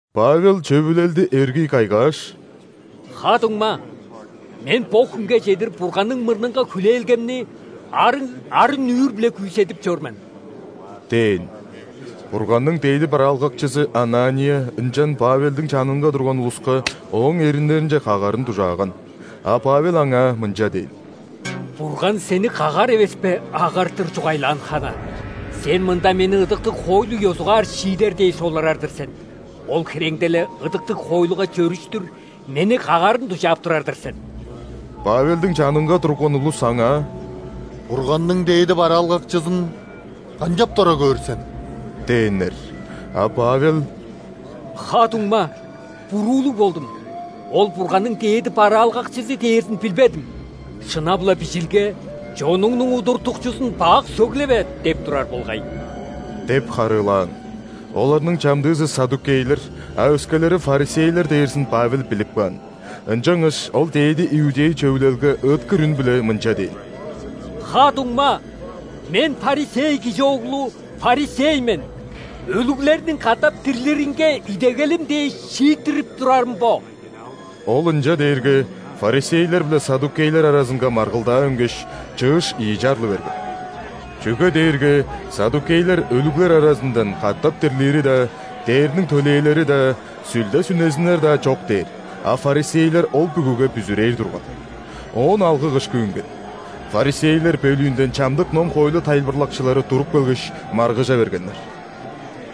Павел Чөвүлелди эргий кайгааш: «Ха-дуңма! Мен бо хүнге чедир Бурганның мурнунга хүлээлгемни арыг арын-нүүр-биле күүседип чор мен» – дээн. Бурганның дээди бараалгакчызы Анания ынчан Павелдиң чанынга турган улуска ооң эриннеринче кагарын дужааган. А Павел аңаа мынча дээн: «Бурган сени кагар эвеспе, агартыр чугайлаан хана. Сен мында мени ыдыктыг хоойлу ёзугаар шиидер дээш олурар-дыр сен, ол хиреңде-ле ыдыктыг хоойлуга чөрүштүр мени кагарын дужаап турар-дыр сен!» Павелдиң чанынга турган улус аңаа: «Бурганның дээди бараалгакчызын канчап дора көөр сен?» – дээннер. А Павел: «Ха-дуңма, буруулуг болдум, ол – Бурганның дээди бараалгакчызы дээрзин билбедим. Шынап-ла, Бижилге: „Чонуңнуң удуртукчузун бак сөглеве“ – деп турар болгай» – деп харыылаан. Оларның чамдыызы ·саддукейлер, а өскелери ·фарисейлер дээрзин Павел билип каан, ынчангаш ол ·дээди иудей Чөвүлелге ыыткыр үн-биле мынча дээн: «Ха-дуңма! Мен фарисей кижи оглу, фарисей мен, өлүглерниң катап дирлиринге идегелим дээш, шииттирип турарым бо». Ол ынча дээрге, фарисейлер биле саддукейлер аразынга маргылдаа үнгеш, чыыш ийи чарлы берген. Чүге дээрге саддукейлер өлүглер аразындан катап дирлири-даа, ·дээрниң төлээлери-даа, сүлде-сүнезиннер-даа чок дээр, а фарисейлер ол бүгүге бүзүрээр турган. Оон алгы-кышкы үнген. Фарисейлер бөлүүнден чамдык ном-хоойлу тайылбырлакчылары туруп келгеш, маргыжа бергеннер: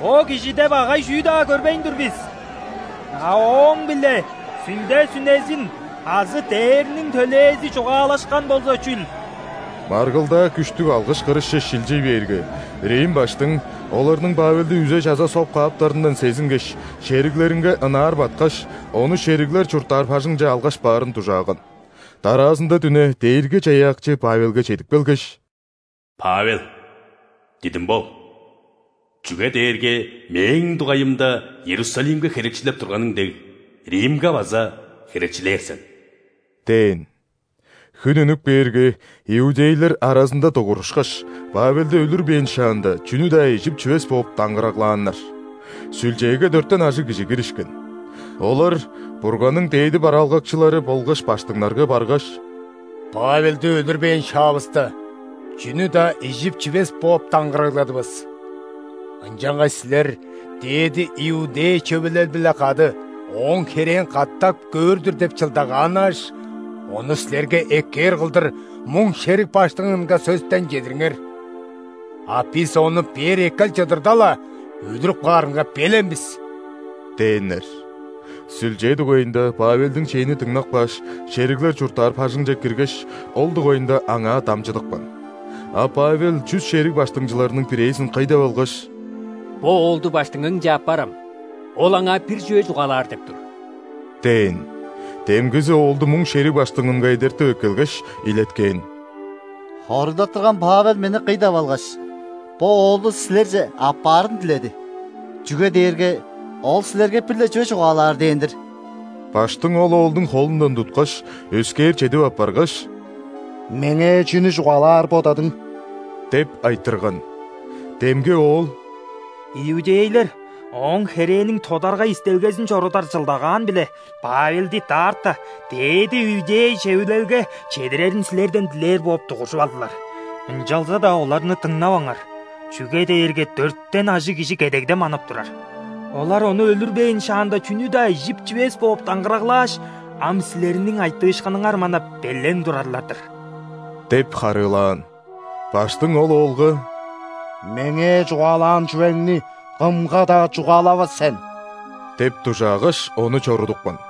«Бо кижиде багай чүү-даа көрбейн тур бис. А ооң-биле сүлде-сүнезин азы дээрниң төлээзи чугаалашкан болза чүл?» Маргылдаа күштүг алгыш-кырышче шилчий бээрге, рим баштың оларның Павелди үзе-чаза соп кааптарындан сезингеш, шериглеринге ынаар баткаш, ону шериглер чурттаар бажыңче алгаш баарын дужааган. Дараазында дүне Дээрги-Чаяакчы Павелге чедип келгеш: «Павел, дидим бол, чүге дээрге Мээң дугайымда Иерусалимге херечилеп турганың дег, Римге база херечилээр сен» – дээн. Хүн үнүп кээрге, иудейлер аразында дугурушкаш, Павелди өлүрбээн шаанда, чүнү-даа ижип-чивес бооп даңгыраглааннар. Сүлчээге дөртен ажыг кижи киришкен. Олар Бурганның дээди бараалгакчылары болгаш ·баштыңнарга баргаш: «Павелди өлүрбээн шаавыста, чүнү-даа ижип-чивес бооп даңгырагладывыс. Ынчангаш силер ·дээди иудей Чөвүлел-биле кады ооң херээн катап көөр-дүр деп чылдагааннааш, ону силерге эккээр кылдыр муң шериг баштыңынга сөстен чедириңер. А бис ону бээр эккел чыдырда-ла, өлүрүп каарынга белен бис» – дээннер. Сүлчээ дугайында Павелдиң чээни дыңнап кааш, шериглер чурттаар бажыңче киргеш, ол дугайында аңаа дамчыдыпкан. А Павел чүс шериг баштыңчыларының бирээзин кый деп алгаш: «Бо оолду баштыңыңче аппарам, ол аңаа бир чүве чугаалаар деп тур» – дээн. Демгизи оолду муң шериг баштыңынга эдертип эккелгеш, илеткээн: «Хоругдаттырган Павел мени кый деп алгаш, бо оолду силерже аппаарын диледи, чүге дээрге ол силерге бир-ле чүве чугаалаар дээн-дир». Баштың ол оолдуң холундан туткаш, өскээр чедип аппаргаш: «Меңээ чүнү чугаалаар бодадың?» – деп айтырган. Демги оол: «Иудейлер ооң херээниң тодаргай истелгезин чорудар чылдагаан-биле Павелди даарта ·дээди иудей Чөвүлелге чедирерин силерден дилээр бооп дугуржуп алдылар. Ынчалза-даа оларны дыңнаваңар, чүге дээрге дөртен ажыг кижи кедегде манап турар. Олар ону өлүрбээн шаанда чүнү-даа ижип-чивес бооп даңгыраглааш, ам силерниң айтыышкыныңар манап, белен турарлар-дыр» – деп харыылаан. Баштың ол оолга: «Меңээ чугаалаан чүвеңни кымга-даа чугаалавас сен» – деп дужаагаш, ону чорудупкан.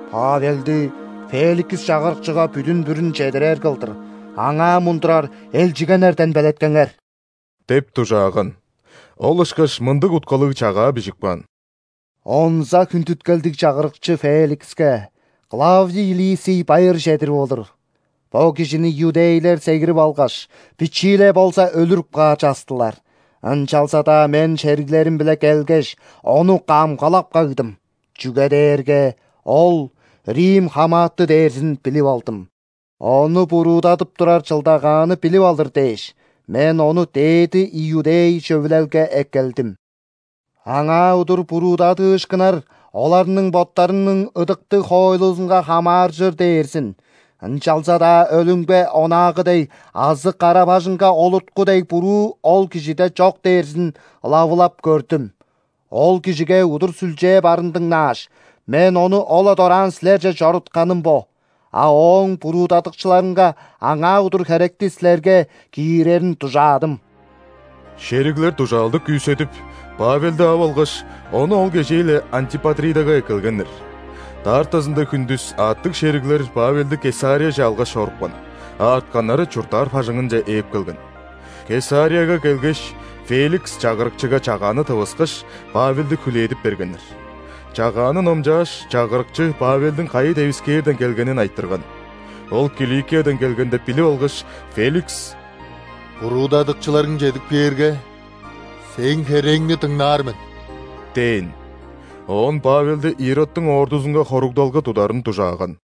Павелди Феликс чагырыкчыга бүдүн-бүрүн чедирер кылдыр, аңаа мундурар элчигеннерден белеткеңер» – деп дужааган. Ол ышкаш мындыг уткалыг чагаа бижип каан: «Онза хүндүткелдиг чагырыкчы Феликске Клавдий Лисий байыр чедирип олур. Бо кижини иудейлер сегирип алгаш, бичии-ле болза өлүрүп каар частылар, ынчалза-даа мен шериглерим-биле келгеш, ону камгалап кагдым, чүге дээрге ол рим хамааты дээрзин билип алдым. Ону буруудадып турар чылдагаанны билип алыр дээш, мен ону ·дээди иудей Чөвүлелге эккелдим. Аңаа удур буруудадыышкыннар оларның боттарының ыдыктыг хоойлузунга хамааржыр дээрзин, ынчалза-даа өлүмге онаагы дег азы кара-бажыңга олуртку дег буруу ол кижиде чок дээрзин ылавылап көрдүм. Ол кижиге удур сүлчээ барын дыңнааш, мен ону ол-ла дораан силерже чорутканым бо. А ооң буруудадыкчыларынга аңаа удур херекти силерге киирерин дужаадым». Шериглер дужаалды күүседип, Павелди ап алгаш, ону ол кежээ-ле Антипатридага эккелгеннер. Даартазында хүндүс аъттыг шериглер Павелди Кесарияже алгаш чорупкан, а артканнары чурттаар бажыңынче ээп келген. Кесарияга келгеш, Феликс чагырыкчыга чагааны тывыскаш, Павелди хүлээдип бергеннер. Чагааны номчааш, чагырыкчы Павелдиң кайы девискээрден келгенин айтырган. Ол Киликиядан келген деп билип алгаш, Феликс: «Буруудадыкчыларың чедип кээрге, сээң херээңни дыңнаар мен» – дээн. Оон Павелди Иродтуң ордузунга хоругдалга тударын дужааган.